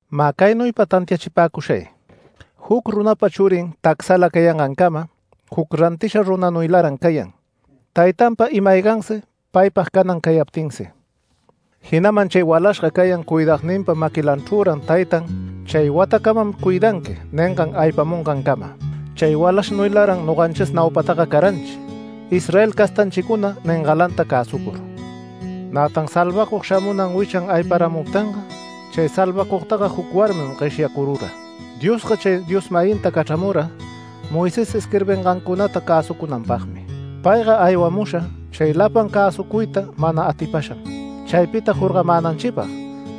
Mä caynuypa tantiachipäcushay: Juc runapa churin tacsala cayangancama juc rantisha runanuylaran cayan, taytanpa ima-aygansi paypag canan cayaptinsi. Jinaman chay walashga cayan cuidagninpa maquilanchrüran taytan “Chay watacamam cuidanqui” ningan aypamungancama. Chay walashnuylaran noganchis naupataga caranchi, Israel castanchicuna ningalanta cäsucur. Nätan salvacug shamunan wichan ayparamuptinga, chay Salvacugtaga juc warmin gueshyacurura. Diosga chay Dios-mayinta cachramura Moisés isquirbingancunata cäsucunanpagmi. Payga aywamusha chay lapan cäsucuyta mana atipasham chaypita jorgamänanchipag,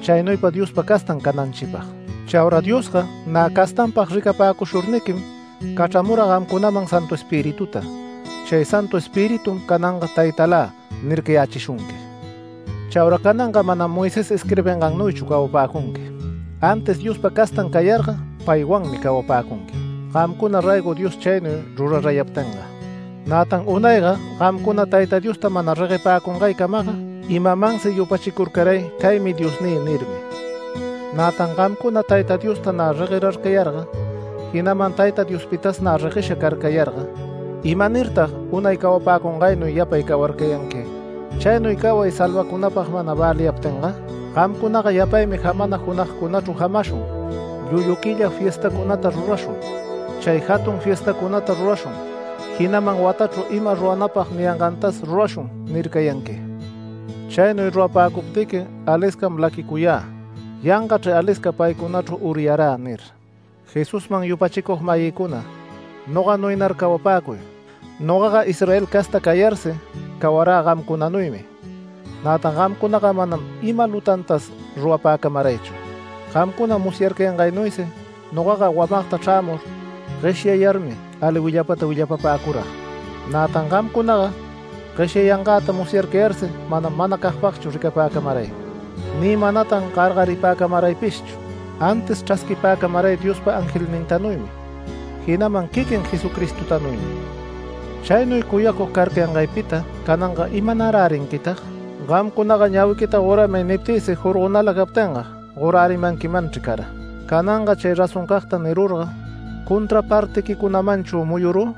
chaynuypa Diospa castan cananchipag. Chaura Diosga nä castanpag ricapäcushurniquim cachramura gamcunaman Santu Espirituta. Chay Santu Espiritum cananga “Taytalä” nircayächishunqui. Chaura cananga manam Moisés isquirbingannuychu cawapäcunqui. Antis Diospa castan cayarga paywanmi cawapäcunqui, gamcuna raygo Dios chaynuy rurarayaptinga. Nätan unayga gamcuna Tayta Diosta mana reguepäcungaycamaga imamansi yupachicurcaray “Caymi diosnï” nirmi. Nätan gamcuna Tayta Diosta nä reguerarcayarga, jinaman Tayta Diospitas nä reguesha carcayarga ¿imanirtag unay cawapäcungaynuy yapay cawarcayanqui, chaynuy caway salvacunapag mana väliyaptinga? Gamcunaga yapaymi jamana junagcunachru jamashun, llullu quilla fiestacunata rurashun, chay jatun fiestacunata rurashun, jinaman “Watachru imata ruranäpag” niyangantas “Rurashun” nircayanqui. Chaynuy rurapäcuptiqui aliscam laquicuyä “Yangachr alisca paycunachru uryarä” nir. Jesusman yupachicug-mayïcuna, noganuynar cawapäcuy. Nogaga Israel casta cayarsi cawarä gamcunanuymi. Nätan gamcunaga manam ima lutantas rurapäcamaraychu. Gamcuna musyarcayangaynuysi, nogaga wamagta chrämur gueshyayarmi ali willapata willapapäcurag. Nätan gamcunaga gueshyayangäta musyarcayarsi manam manacagpagchu ricapäcamaray ni manatan gargaripäcamaraypishchu. Antis chrasquipäcamaray Diospa angelnintanuymi, jinaman quiquin Jesucristotanuymi. ¿Chaynuy cuyacug carcayangaypita cananga imanarärinquitag? Gamcunaga “Ñawiquita goramay” niptïsi jorgonala captinga gorärimanquimanchri cara. ¿Cananga chay razoncagta nirurga contrapartiquicunamanchu muyurü?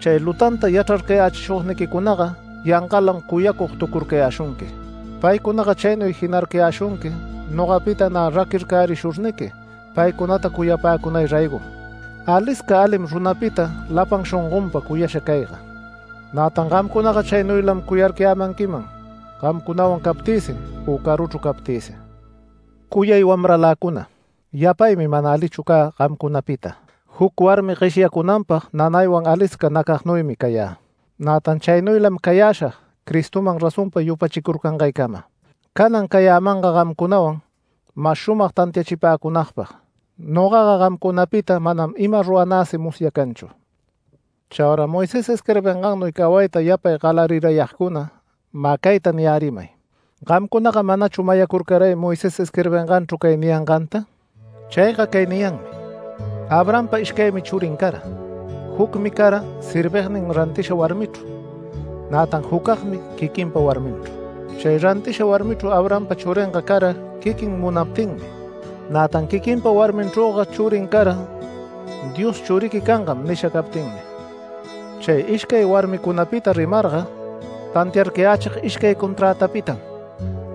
Chay lutanta yachrarcayächishugniquicunaga yangalam cuyagtucurcayäshunqui. Paycunaga chaynuy jinarcayäshunqui nogapita nä raquircärishurniqui paycunata cuyapäcunay raygom. ¡Alisca alim runapita lapan shongonpa cuyasha cayga! Nätan gamcunaga chaynuylam cuyarcayämanquiman gamcunawan captïsi u caruchru captïsi. Cuyay wamraläcuna, yapaymi mana alichu cä gamcunapita. Juc warmi gueshyacunanpag nanaywan alisca nacagnuysi cayä. Nätan chaynuylam cayäshag Cristoman razonpa yupachicurcangaycama. Canan cayämanga gamcunawan mas shumag tantiachipäcunagpag. Nogaga gamcunapita manam ima ruranäsi musyacanchu. Chaura Moisés isquirbingannuy cawayta yapay galarirayagcuna mä cayta niyärimay: ¿Gamcunaga manachu mayacurcaray Moisés isquirbinganchru cay niyanganta? Chayga cay niyanmi: Abrahampa ishcaymi churin cara. Jucmi cara servignin rantisha warmichru, nätan jucagmi quiquinpa warminchru. Chay rantisha warmichru Abrahampa churinga cara quiquin munaptinmi, nätan quiquinpa warminchrüga churin cara Dios “Churiqui cangam” nisha captinmi. Cay ishcay warmicunapita rimarga tantiarcayächig ishcay conträtapitam.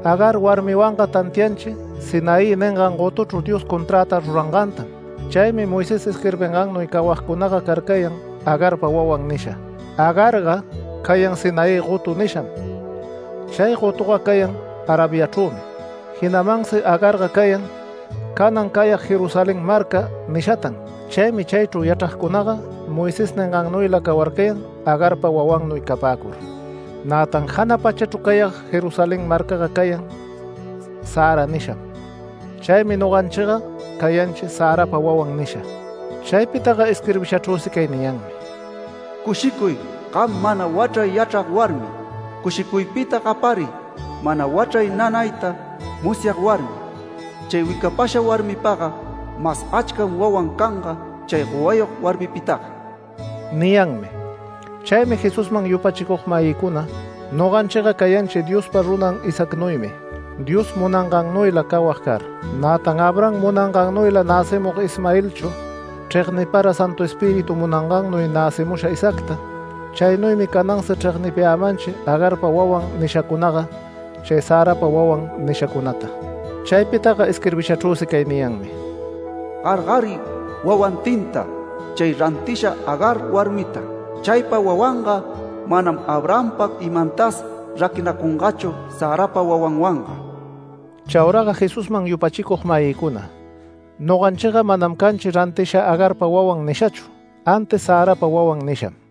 Agar warmiwanga tantianchi Sinaí ningan gotuchru Dios conträta rurangantam. Chaymi Moisés isquirbingannuy cawagcunaga carcayan ‘Agarpa wawan’ nisha. Agarga cayan ‘Sinaí gotu’ nisham. Chay gotuga cayan Arabiachrümi, jinamansi Agarga cayan. Canan cayag ‘Jerusalén Marca’ nishatan. Chaymi chaychru yachragcunaga Moisés ningannuyla cawarcayan, Agarpa wawannuy capäcur. Nätan jana pachachru cayag Jerusalén marcaga cayan ‘Sara’ nisham. Chaymi noganchiga cayanchi ‘Sarapa wawan’ nisha. Chaypitaga isquirbishachru cay niyanmi: “Cushicuy, gam mana wachray yachrag warmi. Cushicuypita gapariy mana wachray nanayta musyag warmi. Chay wicapasha warmipaga mas achcam wawan canga chay gowayog warmipitaga” niyanmi. Chaymi Jesusman yupachicug-mayïcuna, noganchiga cayanchi Diospa runan Isaacnuymi, Dios munangannuyla cawag car. Nätan Abraham munangannuyla näcimug Ismaelchu chregnipara Santu Espíritu munangannuy näcimusha Isaacta. Chaynuymi canansi chregnipämanchi ‘Agarpa wawan’ nishacunaga chay ‘Sarapa wawan’ nishacunata. Chaypitaga isquirbishachrüsi cay niyanmi: “Gargariy wawantinta chay rantisha Agar warmita. Chaypa wawanga manam Abrahampa imantas raquinacungachu Sarapa wawanwanga”. Chauraga Jesusman yupachicug-mayïcuna, noganchiga manam canchi rantisha ‘Agarpa wawan’ nishachu, antis ‘Sarapa wawan’ nisham.